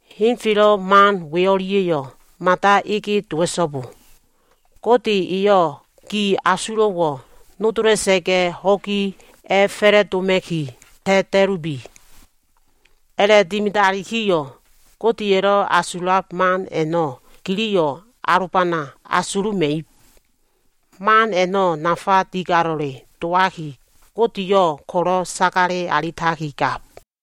Henfelo꞉ man we o꞉lia꞉yo꞉ mada ege dowa꞉so꞉bo. Gode eyo꞉ gi asulo꞉wo꞉ nodola꞉sa꞉ga꞉, ho꞉gi a꞉fa꞉la꞉doma꞉ki ta꞉ta꞉lubi. A꞉la꞉dimidalikiyo꞉ Godeya꞉lo꞉ asulab man a꞉no꞉ giliyo꞉ alobana asuluma꞉ib. Man a꞉no꞉ nafa digalo꞉le dowaki, Godeyo꞉ ko꞉lo꞉ sagale alitakigab.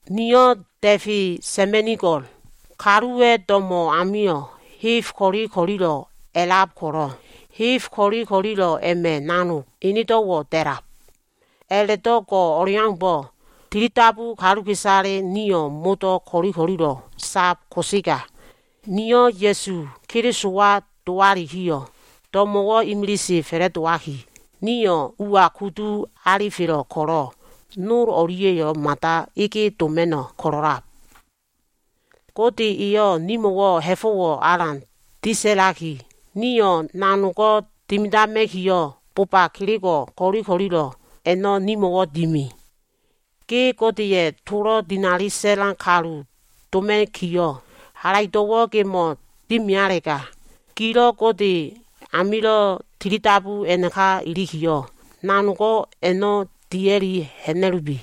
Niyo꞉ da꞉fe sa꞉ma꞉nigo꞉l. Kaluwa꞉ do꞉mo꞉ amio꞉ heb ko꞉li ko꞉lilo꞉ a꞉lab kolo꞉, heb ko꞉li ko꞉lilo꞉ a꞉ma꞉ nanog enedo꞉wo꞉ da꞉lab. A꞉la꞉do꞉ go꞉ o꞉leaumbo꞉, tilidabu kaluka꞉isale nio꞉ modo꞉ ko꞉li ko꞉lilo꞉ sab ko꞉sega, nio꞉ Ya꞉su Kelisowa dowalikiyo꞉, do꞉mo꞉wo꞉ imilise fa꞉la꞉dowaki, nio꞉ ua kudu alifelo꞉ ko꞉lo꞉ nol o꞉lia꞉yo꞉ mada ege doma꞉no꞉ ko꞉lo꞉lab. Gode eyo꞉ nimo꞉wo꞉ ha꞉fo꞉wo꞉ alan disa꞉laki, nio꞉ nanogo꞉ dimidama꞉kiyo꞉, boba kelego꞉ ko꞉li ko꞉lilo꞉ a꞉no꞉ nimo꞉wo꞉ dimi. Ge Godeya꞉ tolo꞉ dinali sa꞉lan kalu doma꞉kiyo꞉, halaido꞉wo꞉ gemo꞉ dimilalega, gilo꞉ Gode amilo꞉ tilidabu a꞉naka ilikiyo꞉, nanogo꞉ a꞉na dia꞉li ha꞉na꞉lubi.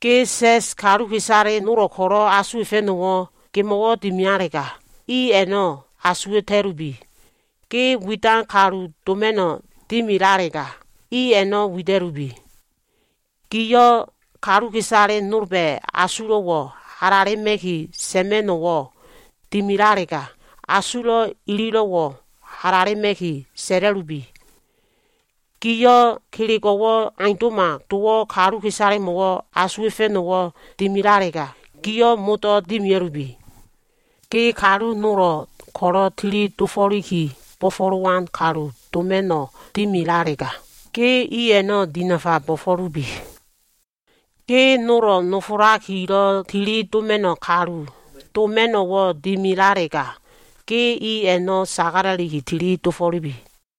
Ge sa꞉s kaluka꞉isale nolo꞉ ko꞉lo꞉ asuwa꞉fa꞉no꞉wo꞉ gemo꞉wo꞉ dimilalega, i a꞉no꞉ asuwa꞉ta꞉lubi. Ge widan kalu doma꞉no꞉ dimilalega, i a꞉no꞉ wida꞉lubi. Giyo꞉ kaluka꞉isale nolba꞉ asulo꞉wo꞉ halalema꞉ki sa꞉ma꞉no꞉wo꞉ dimilalega, asulo꞉ ililo꞉wo꞉ halalema꞉ki sa꞉la꞉lubi. Giyo꞉ kelego꞉wo꞉ aundo꞉ma dowo꞉ kaluka꞉isalemo꞉lo꞉ asuwa꞉fa꞉no꞉wo꞉ dimilalega, gio꞉ modo꞉ dimia꞉lubi. Ge kalu nolo꞉ ko꞉lo꞉ tili dofo꞉liki bo꞉fo꞉lowan kalu doma꞉no꞉ dimilalega, ge i a꞉no꞉ dinafa bo꞉fo꞉lubi. Ge nolo꞉ nofolakilo꞉ tili doma꞉no꞉ kalu doma꞉no꞉wo꞉ dimilalega, ge i a꞉no꞉ sagala꞉li tili dofo꞉lubi.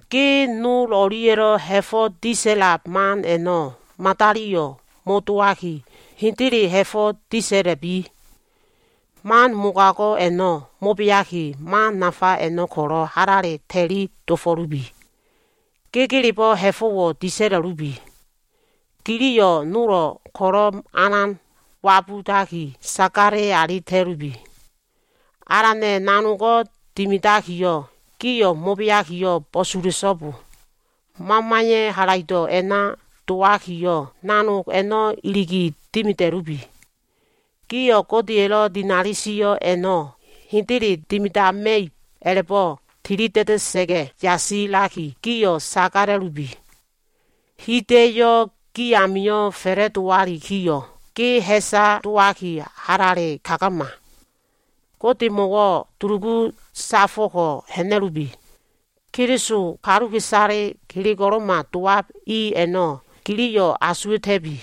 Ge nol o꞉lia꞉lo꞉ ha꞉fo꞉ disa꞉lab man a꞉no꞉ madaliyo꞉ mo꞉dowaki, hendele ha꞉fo꞉ disa꞉la꞉bi. Man mogago꞉ a꞉no꞉ mo꞉beaki, man nafa a꞉no꞉ ko꞉lo꞉ halale ta꞉li dofo꞉lubi. Gegelebo꞉ ha꞉fo꞉wo꞉ disa꞉la꞉lubi. Giliyo꞉ nolo꞉ ko꞉lo꞉ alan wabudaki sagale alita꞉lubi. Alana꞉ nanogo꞉ dimidakiyo꞉, gio꞉ mo꞉beakiyo꞉ bo꞉sula꞉so꞉bo. Mamaya꞉ halaido꞉ a꞉na dowakiyo꞉, nanog a꞉no꞉ iligi dimida꞉lubi. Gio꞉ Godeya꞉lo꞉ dinali sio꞉ a꞉no꞉ hendele dimidama꞉ib a꞉la꞉bo꞉ tilida꞉da꞉sa꞉ga꞉ yasilakiyo꞉, gio꞉ sagala꞉lubi. Hida꞉yo꞉wo꞉ ge amio꞉ fa꞉la꞉dowalikiyo꞉, ge ha꞉sa dowaki halale kagama. Godemo꞉wo꞉ dulugu safo꞉ko꞉ ha꞉na꞉lubi. Keliso kaluka꞉isale kelego꞉lo꞉ma dowab i a꞉no꞉ giliyo꞉ asuwa꞉ta꞉bi.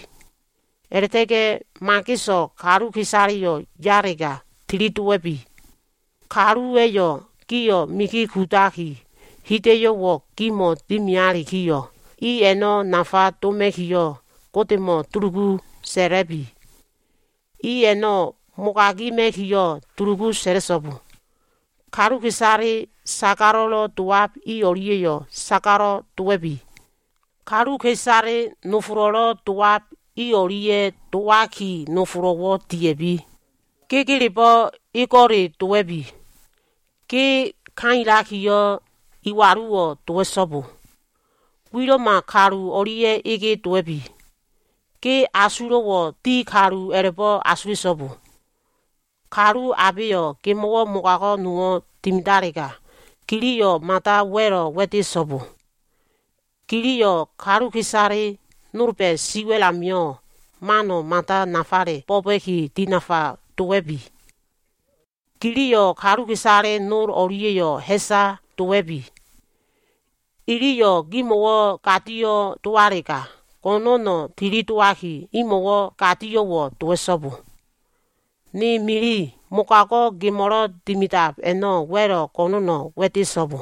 A꞉la꞉ta꞉ga꞉ mageso꞉ kaluka꞉isaleyo꞉ yalega, tilidowa꞉bi. Kaluwa꞉yo꞉ gio꞉ migi kudaki, hida꞉yo꞉wo꞉ gimo꞉ dimialikiyo꞉, i a꞉no꞉ nafa doma꞉kiyo꞉, Godemo꞉ dulugu sa꞉la꞉bi. I a꞉no꞉ mogagima꞉kiyo꞉ dulugu sa꞉la꞉so꞉bo. Kaluka꞉isale sagalo꞉lo꞉ dowab i o꞉lia꞉yo꞉ sagalo꞉ dowa꞉bi. Kaluka꞉isale nofolo꞉lo꞉ dowab i o꞉lia꞉ dowaki nofolo꞉wo꞉ dia꞉bi. Gegelebo꞉ ego꞉le dowa꞉bi. Ge kailakiyo꞉, iwaluwo꞉ dowa꞉so꞉bo. Wilo꞉ma kalu o꞉lia꞉ ege dowa꞉bi. Ge asulo꞉wo꞉ di kalu a꞉la꞉bo꞉ asula꞉so꞉bo. Kalu abeyo꞉ gimo꞉wo꞉ mogago꞉ nowo꞉ dimidalega, giliyo꞉ mada wa꞉lo꞉ wa꞉dea꞉so꞉bo. Giliyo꞉ kaluka꞉isale nolba꞉ siwa꞉l amio꞉ mano꞉ mada nafale bo꞉ba꞉ki dinafa dowa꞉bi. Giliyo꞉ kaluka꞉isale nol o꞉lia꞉yo꞉ ha꞉sa dowa꞉bi. Iliyo꞉ gimo꞉wo꞉ gadio꞉wo꞉ dowalega, go꞉no꞉no꞉ tilidowaki imo꞉wo꞉ gadio꞉wo꞉ dowa꞉so꞉bo. Ni mili, mogago꞉ gemo꞉lo꞉ dimidab a꞉no꞉ wa꞉lo꞉ go꞉no꞉no꞉ wa꞉dea꞉so꞉bo.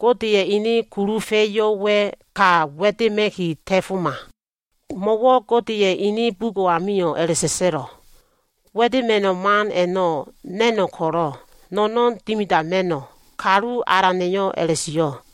Godeya꞉ ene kulufa꞉yo꞉wa꞉ ka wa꞉dema꞉ki ta꞉foma. Mo꞉wo꞉ Godeya꞉ ene bugo꞉ amio꞉ a꞉la꞉sa꞉sa꞉lo꞉, “Wa꞉dema꞉no꞉ man a꞉no꞉ na꞉no꞉ ko꞉lo꞉, no꞉no꞉n dimidama꞉no꞉” Kalu Alana꞉yo꞉ a꞉la꞉sio꞉.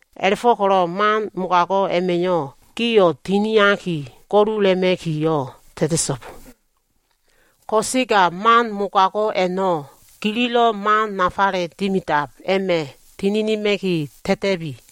A꞉la꞉fo꞉ko꞉lo꞉ man mogago꞉ a꞉ma꞉yo꞉ gio꞉ tiniaki go꞉lula꞉ma꞉kiyo꞉ ta꞉ta꞉so꞉bo. Ko꞉sega man mogago꞉ a꞉no꞉ gililo꞉ man nafale dimidab a꞉ma꞉ tininima꞉ki ta꞉ta꞉bi.